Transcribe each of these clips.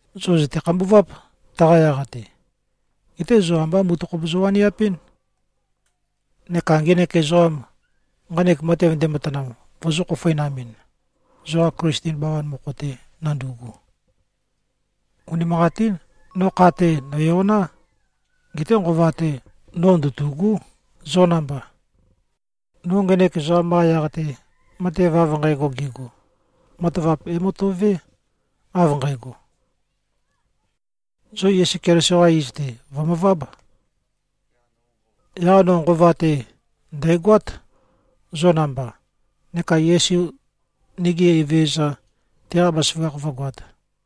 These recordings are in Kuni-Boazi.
Zo zø̀te-khambuváp, taqa yaq-te. Geté zo ambá mutøkhop zowaniapɨ́n neka ngenek ezoqam, nqanek matev ndematanam, vozō-khofoinamɨn, zoqa Klisten bawan mokho-te nandu꞉gu. Unimanqatín. No kha-te, nø̀yoná. Geté nqova-te, no ndøtû꞉gú, zo namba. No ngenek ezoqam-qa yaq-te, matev av nqægo gego, matavap é-møto꞉vé, av nqægo: Zo Yesu Keliso-qa iz-te, vø̀møváb. Yaq no nqova-te, ndæ̀goát, zo namba, neka Yesu, nigi Evezøza, teqa bazaføgakh vǿgoāt.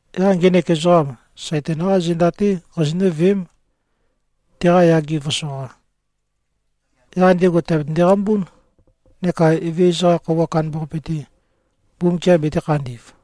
Yaq ngenek ezoqam, Saitan-qá zenda-té qazinǿ-veém, teqa yage vǿsoqā. Yaq ndego tèabetønde-qambún, neka Evezøza-qa Khøuwa Kandambaqape-te, Mbumbukiam betē-khandi꞉v.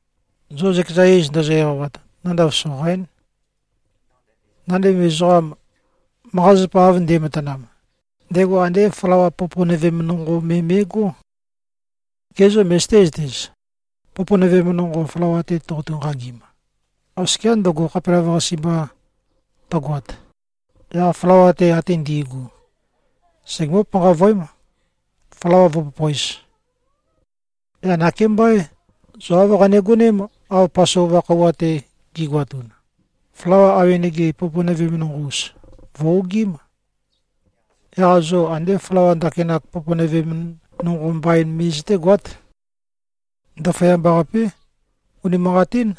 Zo zøkeza iz ndozo-eqawat, nandav soqaín. Nandev ezoqam, manqa-zapa av nde꞉matanam, ndego andé flawa poponøvem nonqo me me꞉gó. Ge zô, møzøté-zøtez? Poponøvem nonqo flawa-te toqotu-nqagim, oskiá ndøgo, khapelavøqase mba tøgoat, yaq flawa-te ate ndi꞉gu segemǿ-panqavøém, flawa vǿpopōez. Yaq nakémbá, zo āv qanegoném, av Pasova khøuwa-te gi꞉goatun. Flawa awenege poponøvem nonqo-us, vø̀-ogiím. Yaq zo andé flawa ndakinak poponøvem nonqo mbain me zøtégoát. Ndaføyamba-qapé. Unimanqatín,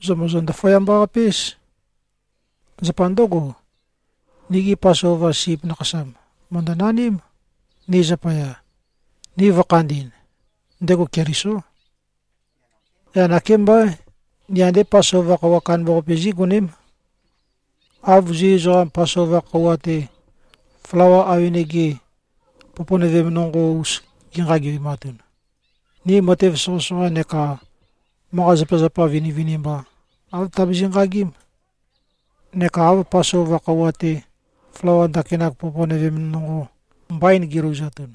zo mòzo-ndaføyamba-qape-éz. Zapa ndǿgo, nigi Pasova sip nakhasam, mø̀ndønaním, ni zapaya, ni vø̄khandi꞉n. Ndego Kelisó. Yaq nakémbá. Ni andé Pasova khøuwa kandambaqape zí꞉goném. Av Zu ezoqam, Pasova khøuwa-te, flawa awenege poponøvem nonqo-us gi꞉nqagevematun, ni matev soqøsoqa neka manqa-zapazapa vinivinimba, āv tabizi꞉-nqagím. Neka av Pasova khøuwa-te, flawa ndakinak poponøvem nonqo mbain gilouzatun,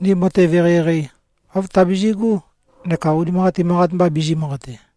ni matev eqeieqei, āv tabizi꞉gú neka unimanqatin manqat mba bizī-manqate.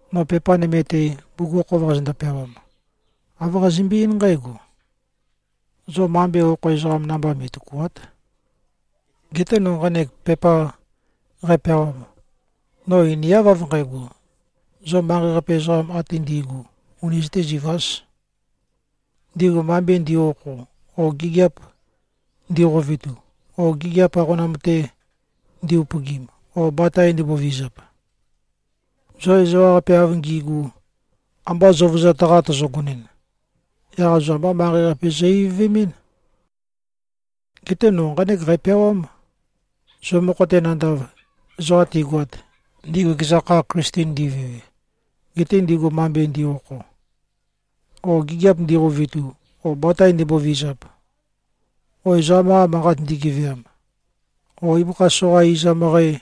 No pepa nøme-te, bugukhokhof qazøndo-peawam, āv qazømbe-eín nqǽgo: Zo mambe okho ezoqam namba me꞉tøkùa᷄t. Geté no nqanek manqat qæpeawam, no einiáv av nqægo, zo manqei-qape ezoqam ate ndi꞉gu, uni zøtēzivāz, ndigu mambe ndi꞉-okho o gigiap ndiqovetu o gigiap aqonam-te ndi-upøgim o batae ndimbovizap. Zo ezoqa ewaqape av ngi꞉gu, amba zøuvøzat-qa tozogoɨn, yaq zo ambá manqei-qape zo-ivøvemɨ́n. Geté no nqánek qæpeawám: Zo mokho-te nandav, ezoqa tigoat, ndigu ekeza kha Klisten ndi꞉vewe, gete ndigu mambe ndi꞉-okho, o gigiap ndiqovetu o batae ndimbovizap o ezoqam-qa manqa ndigeveam o ibøkha soqa izam møqæ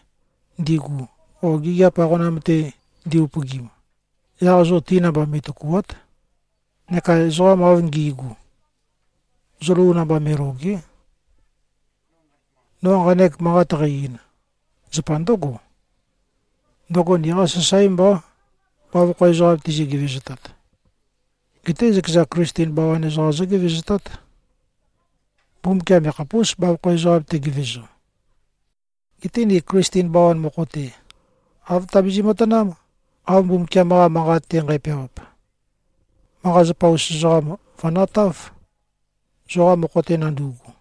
ndigu o gigiap aqonam-te ndi-upøgim, yaq zo ti namba me꞉tøkùa᷄t. Neka ezoqam av ngi꞉gu, zo lou namba me꞉lòge᷄. No nqanek manqat qæ-ein, zapa ndǿgo: Ndøgo niqá sasáe mbá, bavokho ezoqam tizi-gevezotat. Geté zøkeza Klisten bawan ezoqam zógevezotát. Mbumbukiam yakhapús, bavokho ezoqam tegevezo. Geté ni Klisten bawan mokho-te, āv tabizi꞉-matanám, av Mbumbukiam-qa Manqat-te nqæpeawap: Manqa-zapa-us ezoqam, vø̀natáv, zoqa mokho-te nandu꞉gu.